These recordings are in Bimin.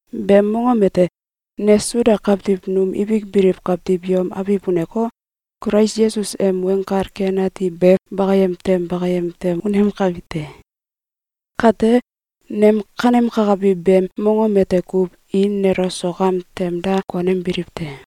Beem mongom ete, ne Suda kawtiw num ibik biliw kawtiw yom abiw uneko, Kulais Yesus em Weng Kal Ken Ati be bakayem tem bakayem tem unemkabi te. Kate, nem kanemkakabi beem mongom ete kuw, i nelo sok am tem da konembiliw te.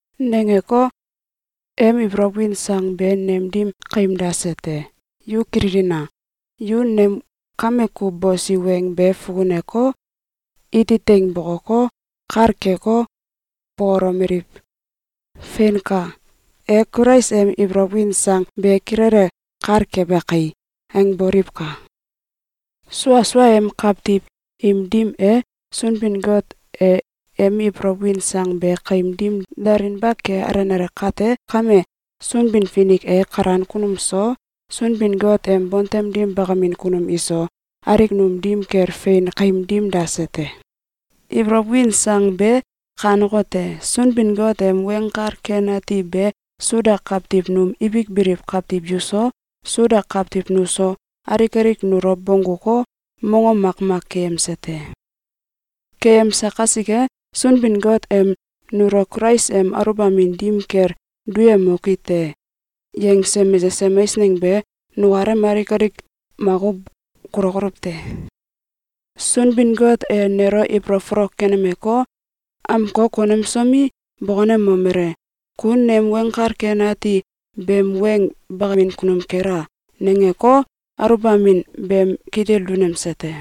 Nangeko, em ibolow win sang be nem dim kaim dase te. Yu kililina! Yu nem kame kuw bosi weng be fukuneko, iti teing bokoko, kal keko, bokolomeliw: “Feinka! E Kulais em ibolow win sang be kilele kal kebe kai!”, angboliwka! Sua suaem kawtiw im dim e, Sunbin-Got e em ibolow win sang be kaim dim dalinba ke alenale kate kame, Sunbin-Finik e kalan kunum so, Sunbin-Got em bontem dim bakamin kunum iso, alik num dim kel fein kaim dim dase te. Ibolow win sang be kanekote: Sunbin-Got em Weng Kal Ken Ati be Suda kawtiw num ibik biliw kawtiw yuso, Suda kawtiw nuso, alik alik nulo bongguko, mongom makmak keyemse te. Keyemse kasike, Sunbin-Got em “Nulo Kulais em aluwbamin dim kel duyemoki te!”, yangse mesesem eisneng be nukalem alik alik makuw kulokoluw te. Sunbin-Got e nelo ibolow folok kenemeko, amko konemsomi, bokonemomele: “Ku nem Weng Kal Ken Ati beem weng bakamin kunum kela!”, nangeko, aluwbamin beem kitil dunemse te.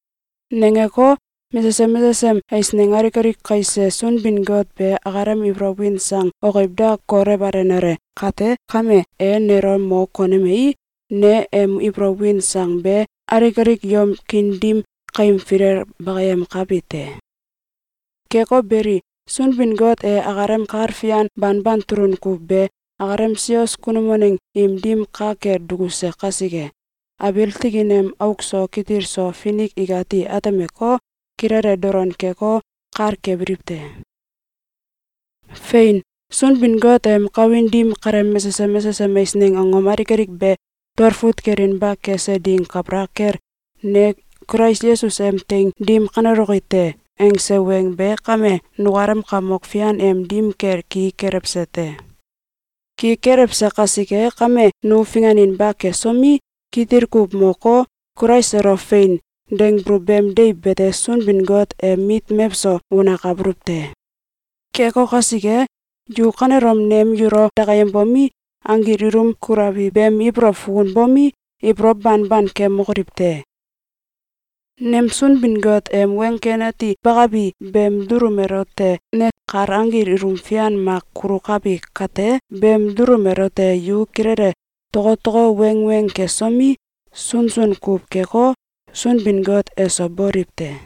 Nangeko, mesesem mesesem eisneng alik alik kaise Sunbin-Got be akalem ibolow win sang okiw da kolewalenale kate kame, e nelo mo konemei, ne em ibolow win sang be alik alik yom kiin dim kaim filel bakayemkabi te. Keko beli, Sunbin-Got e akalem kal fian banban tulun kuw be akalem sios kunum waneng im dim ka kel dukuse kasike, abiil tikin em auk so kitil so finik ikati atemeko, kilele dolon keko, kal kebiliw te. Fein! Sunbin-Got em kawin dim kaleem mesesem mesesem eisneng angom alik alik be talfut kelinba kese ding kabalak kel “Ne Kulais Yesus em teing dim kaneloki te!”, angse weng be kame nukalem Kamok Fian em dim kel ki kelewse te. Ki kelewse kasike kame, nu finganinba kesomi, kitil kuw moko, Kulais elo “Fein!”, dangbuluw beem deiw bete Sunbin-Got em mit mewso unakabuluw te. Keko kasike, yu kanelom nem yulo dakayembomi, anggil ilum kulabi beem ibolow fukunbomi, ibolow banban kemokoliw te! Nem Sunbin-Got em Weng Ken Ati be Bakabi beem dulum elote ne kal anggil ilum fian mak kulukabi kate, beem dulum elote yu kilele tokotoko wanengweng kesomi, sunsun kuw keko, Sunbin-Got eso boliw te.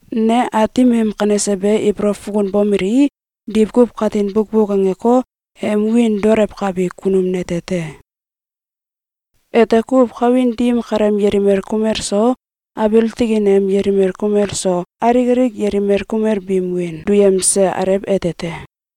Ne Aatim em kanese be ibolow fukunbomelei, diwkuw katin bukbuk angeko, em wiin daolewkabi kunum nete te. Ete kuw kawin dim kaleem yelimel kumel so, abiil tikin em yelimel kumel so, alik alik yelimel kumel biim wiin duyemse Alew ete te.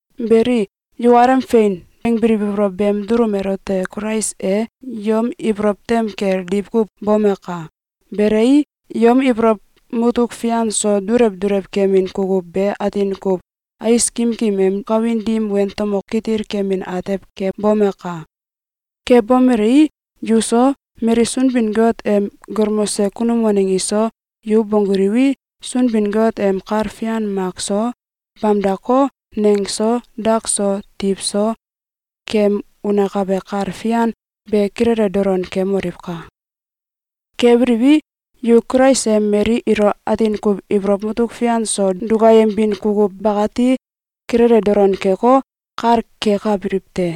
Belei, yukalem “Fein!”, angbiliw ibolow beem dulum elote Kulais e yom ibolow tem kel diwkuw bomaka! Belei, yom ibolow mutuk fian so dulew dulew kemin kukuw be atin kuw ais kimkim em kawin dim wentomo kitil kemin atew kebomaka! Kebomelei, yuso, mali Sunbin-Got em galmose kunum waneng iso, yu bongguliwi, Sunbin-Got em kal fian mak so, bamdako, neng so, dak so, tiw so, kem unakabe kal fian be kilele dolon kemoliwka! Kebiliwi, yu Kulais em mali ilo atin kuw ibolow mutuk fian so dukayembin kukuw bakati kilele dolon keko, kal kekabiliw te.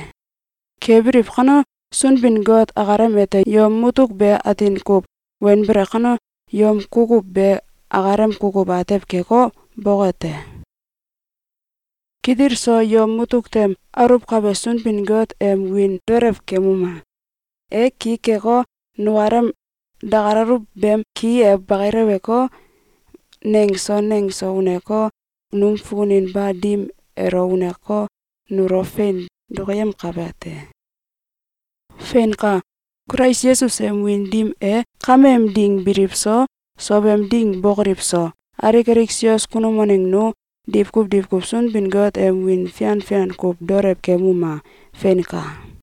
Kebiliw kano, Sunbin-Got akalem ete yom mutuk be atin kuw wenbele kano, yom kukuw be akalem kukuw atew keko, boke te. Kitil so yom mutuk tem aluwkabe Sunbin-Got em wiin daolewkemuma! E ki keko, nukalem dakalaluw beem ki e bakileweko, neng so neng so uneko, num fukuninba dim elo uneko, nulo fein dokoyemkabe te. Feinka! Kulais Yesus em wiin dim e kameem ding biliw so, sowem ding bokoliw so, alik alik sios kunum waneng nu diwkuw diwkuw Sunbin-Got em wiin fian fian kuw daolew kemuma! Feinka!